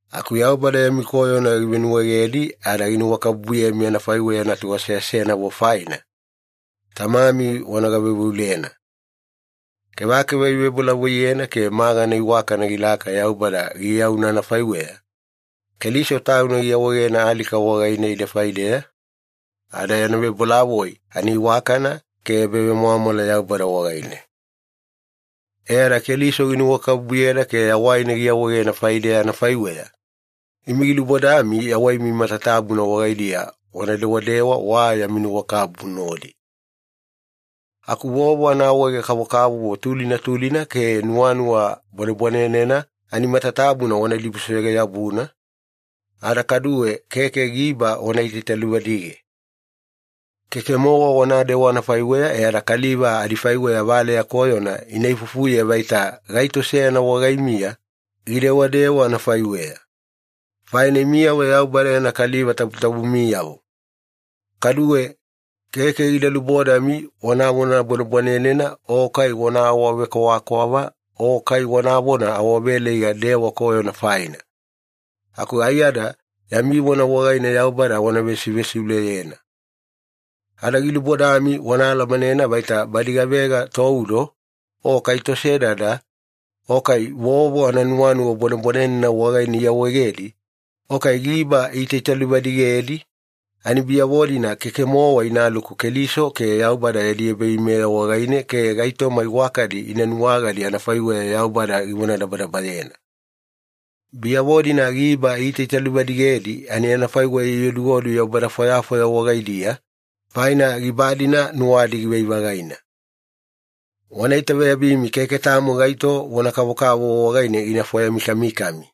Aku Yaubada yami koyona givenuwaegedi ada ginuwakabubuyemi anafaiweya natu aseasenavo faina, Tamami wana gaveuveulena. Kevakeva ivebolavoiyena ke magana iwakana gilaka Yaubada giyauna anafaiweya, Keliso Tauna giawaegena alika wagaine ide faideya, ada yana vebolavoi ani iwakana ke ebavemwamwala Yaubada wagaine. E ada Keliso ginuwakabubuyeda ke yawaina giawaegena faideya anafaiweya, imi gilubodami yawaimi matatabuna wagaidiya wana dewadewa wa yami nuwakabubu nodi. Aku vovo anaawaege-kavokavovo tulina tulina ke nuwanuwa bwanebwanenena ani matatabuna wana dibusoyoge-yabuna, ada kaduwe keke giba wana itaitaluvadige. Keke-mowa wanadewa anafaiweya e ada kaliva adifaiweya valeya koyona ina ifuifufuye vaita gaito seyana wagaimiya gidewadewa anafaiweya. Faina imiyavo Yaubada yana kaliva tabutabumiyavo. Kaduwe, keke gida lubodami wanavona bwanebwanenena o kai wana awavekwavakwava o kai wanavona awaveleiga dewa koyona faina. Aku aiyada yami vona wagaine Yaubada wana vesivesiuleyena. Ada gilubodami wana alamanena vaita badi gavega toudo, o kai tosedada, o kai vovo ananuwanuwa bwanebwanenena wagaine iawaegedi, o kai giba iitaitaluvadigedi, ani biyavo-dina keke-mowa inaluku Keliso ke Yaubada yadi ebaveimeya wagaine ke gaitoma iwakadi ina nuwagadi anafaiweya Yaubada givonadabadabayena. Biyavo-dina giba iitaitaluvadigedi ani anafaiweya ioduodu yaubada fwayafwaya wagaidiya, faina giba-dina nuwadi givai-vagaina. Wana itaveyabimi keke tamo gaito vona kavokavovo wagaine gina fwayamikamikami.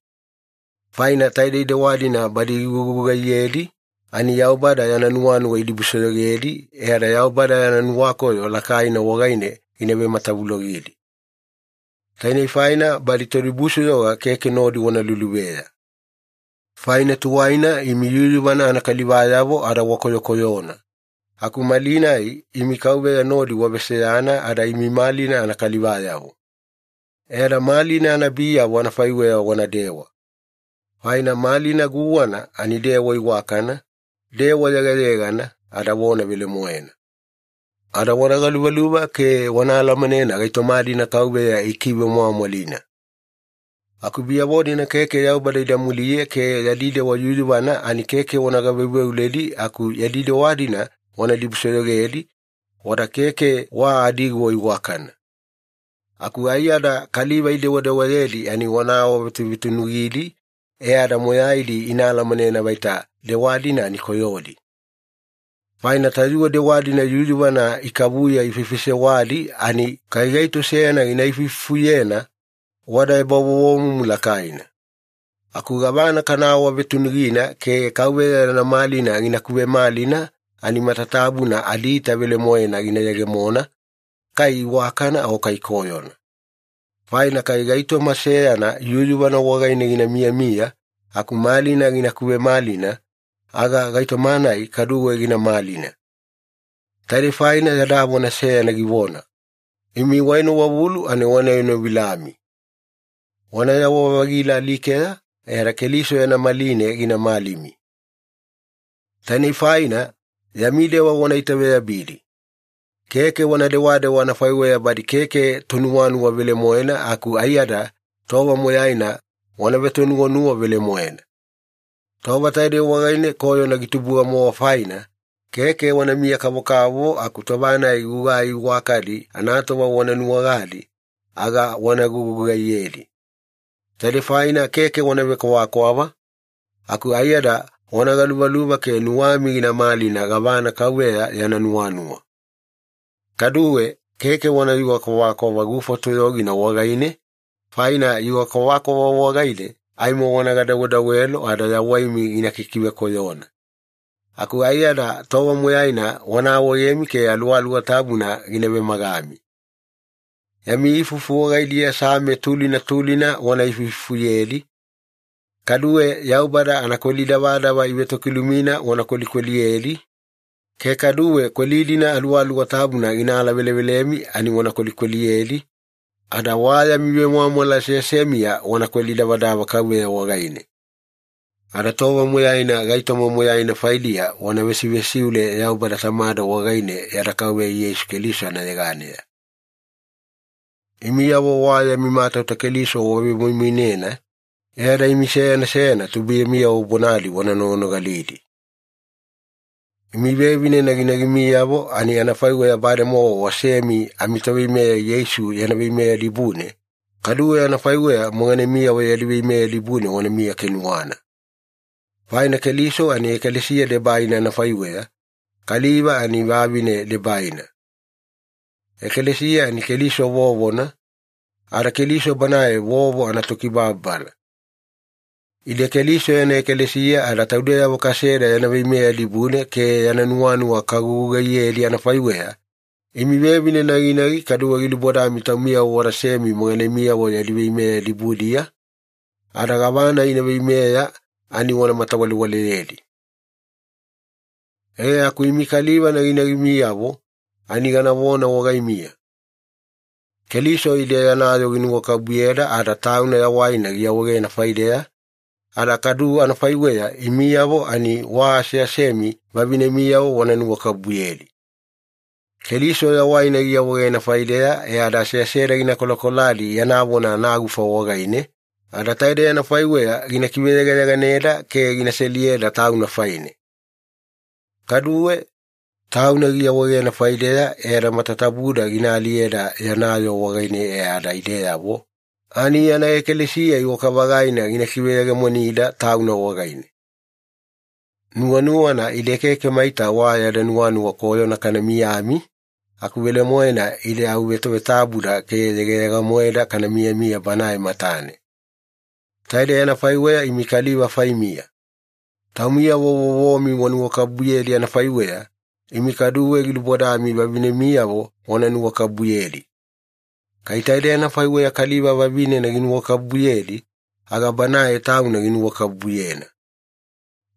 Faina taidei dewa-dina badi igugugaiyedi ani Yaubada yana nuwanuwa idibusoyogedi, e ada Yaubada yana nuwakoyo lakaina wagaine gina vematavulogidi. Tainei faina badi todibusoyoga keke nodi wana luluveya. Faina tuwaina imi yuyuvana anakalivayavo ada wakoyokoyona, aku malinai imi Kauveya nodi waveseyana ada imi malina anakalivayavo. E ada malina anabiyavo anafaiweya wanadewa. Faina malina guwana ani dewa iwakana, dewa yegayegana, ada vona velemoena. Ada wana galuvaluva ke wana alamanena gaitoma-dina Kauveya ikivemwamwalina. Aku badiyavo keke Yaubada ida muliye ke yadi dewa yuyuvana ani keke wana gaveuveuledi aku yadi dewa-dina wana dibusoyogedi, wada keke wa adiguwa iwakana. Aku aiyada kaliva idewadewayedi ani wana awavetuvetunugidi e ada moyaidi ina alamanena vaita dewa-dina ani koyodi. Faina tayuwe dewa-dina yuyuvana ikavuya ifaifaisewadi ani kai gaito seyana gina ifuifufuyena, wada ebavovomumu lakaina. Aku gavana kana awavetunugina ke Kauveya yana malina gina kuvemalina ani matatabuna adiita velemoena gina yegemona, kai iwakana o kai koyona. Faina kai gaitoma seyana yuyuvana wagaine gina miyamiya aku malina gina kuvemalina, aga gaitoma-nai kaduwe gina malina. Taidei faina yada vona seyana givona, “Imi waenowavulu ani wana enovilami. Wanayawa-vagila alikeya e ada Keliso yana maline gina malimi.” Tainei faina, yami dewa wana itaveyabidi. Keke wana dewadewa anafaiweya badi keke tonuwanuwa velemoena aku aiyada tova moyaina wana vetonuwanuwa velemoena. Tova taidei wagaine koyona gitubuga-mowa faina, keke wanamiya-kavokavovo aku tova-nai gugai iwakadi anatova wana nuwagadi, aga wana gugugaiyedi. Taidei faina keke wana vekwavakwava, aku aiyada wana galuvaluva ke nuwami gina malina gavana Kauveya yana nuwanuwa. Kaduwe, keke wanayuga kwavakwava gufa toyogina wagaine, faina yuga kwavakwava wagaine aimo wana gadawedawelo ada yawaimi gina kikivekoyona. Aku aiyada tova moyaina wana awaegemi ke Aluwaluwa Tabuna gina vemagami. Yami ifufu wagaidiya Same tulina tulina wana veifuifufuyedi, kaduwe Yaubada anakweli davadava ivetokilumina wana kwelikweliyedi, ke kaduwe kweli-dina Aluwaluwa Tabuna gina alavelevelemi ani wana kwelikweliyedi, ada wa yami vemwamwala aseasemiya wana kweli davadava Kauveya wagaine. Ada tova moyaina gaitoma moyaina faidiya wana vesivesiule Yaubada Tamada wagaine yada Kauveya Yeisu Keliso anayeganeya. Imiyavo wa yami matauta Keliso wavemoimoinena, e ada imi seyana seyana tubuiyamiyavo bonadi wana noganogalidi. Imi vevine naginagimiyavo ani anafaiweya bademowa wasemi amiToveimeya Yeisu yana veimeya dibune, kaduwe anafaiweya moganemiyavo yadi veimeya dibune wanamiya kenuwana. Faina Keliso ani ekalesiya debaina anafaiweya, kaliva ani vavinena debaina. Ekalesiya ani Keliso vovona, ada Keliso Banae vovo anaTokibababala. Ide Keliso yana ekalesiya ada taudeyavo kaseda yana veimeya dibune ke yana nuwanuwa kagugugaiyedi anafaiweya, imi vevine naginagi kaduwe gilubodami taumiyavo wadasemi moganemiyavo yadi veimeya dibudiya, ada gavana ina veimeya ani wana matawalewaleyedi. E aku imi kaliva naginagimiyavo ani ganavona wagaimiya. Keliso ide yana yoo ginuwakabubuyeda ada Tauna yawaina giawaegena faideya, ada kadu anafaiweya imiyavo ani wa aseasemi vavinemiyavo wana nuwakabubuyedi. Keliso yawaina giawaegena faideya e ada aseaseda gina kolakoladi yana vona anagufa wagaine, ada taidei anafaiweya gina kiveyegayeganeda ke gina seliyeda Tauna faine. Kaduwe, Tauna giawaegena faideya e ada matatabuda gina aliyeda yana yoo wagaine, e ada ideyavo ani yana ekalesiya iwaka-vagaina gina kiveyegemonida Tauna wagaine. Nuwanuwana ide keke maita wa yada nuwanuwa koyona kana miyami, aku velemoena ide au vetavetabuda ke yegayega-moeda kana miyamiya Banae matane. Taidei anafaiweya imi kaliva faimiya. Taumiyavo vovomi wanuwakabubuyedi anafaiweya, imi kaduwe gilubodami vavinemiyavo wana nuwakabubuyedi. Kai taidei anafaiweya kaliva vavinena ginuwakabubuyedi, aga banae tauna ginuwakabubuyena.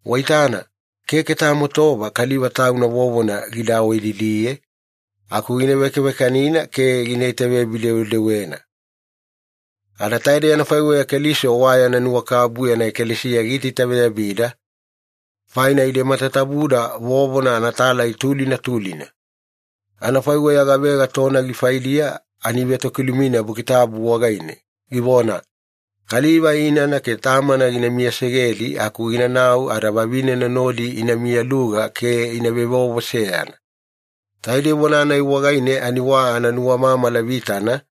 Waitana, keke tamo tova kaliva tauna vovona gida awaididiye, aku gina vekavekanina ke gina itaveyabi-dewedewena. Ada taidei anafaiweya Keliso wa yana nuwakabubu yana ekalesiya giitaitaveyabida, faina ide matatabuda vovona anatalai tulina tulina. Anafaiweya gavega tonagi faidiya ani ivetokilumina Buki Tabu wagaine, givona, “Kaliva inana ke tamana gina miyasegedi aku ginanau ada vavinena nodi ina miyaluga ke ina vevovo seyana.” Taidei vona-nai wagaine ani wa ananuwamamala vitana,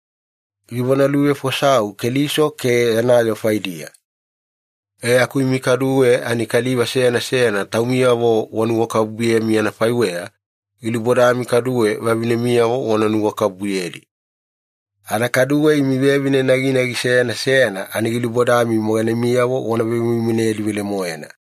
givonaluvefosau Keliso ke yana yoo faidiya. E aku imi kaduwe ani kaliva seyana seyana taumiyavo wanuwakabubuyemi anafaiweya, gilubodami kaduwe vavinemiyavo wana nuwakabubuyedi. Ada kaduwe imi vevine naginagi seyana seyana ani gilubodami moganemiyavo wana vemoimoinedi velemoena.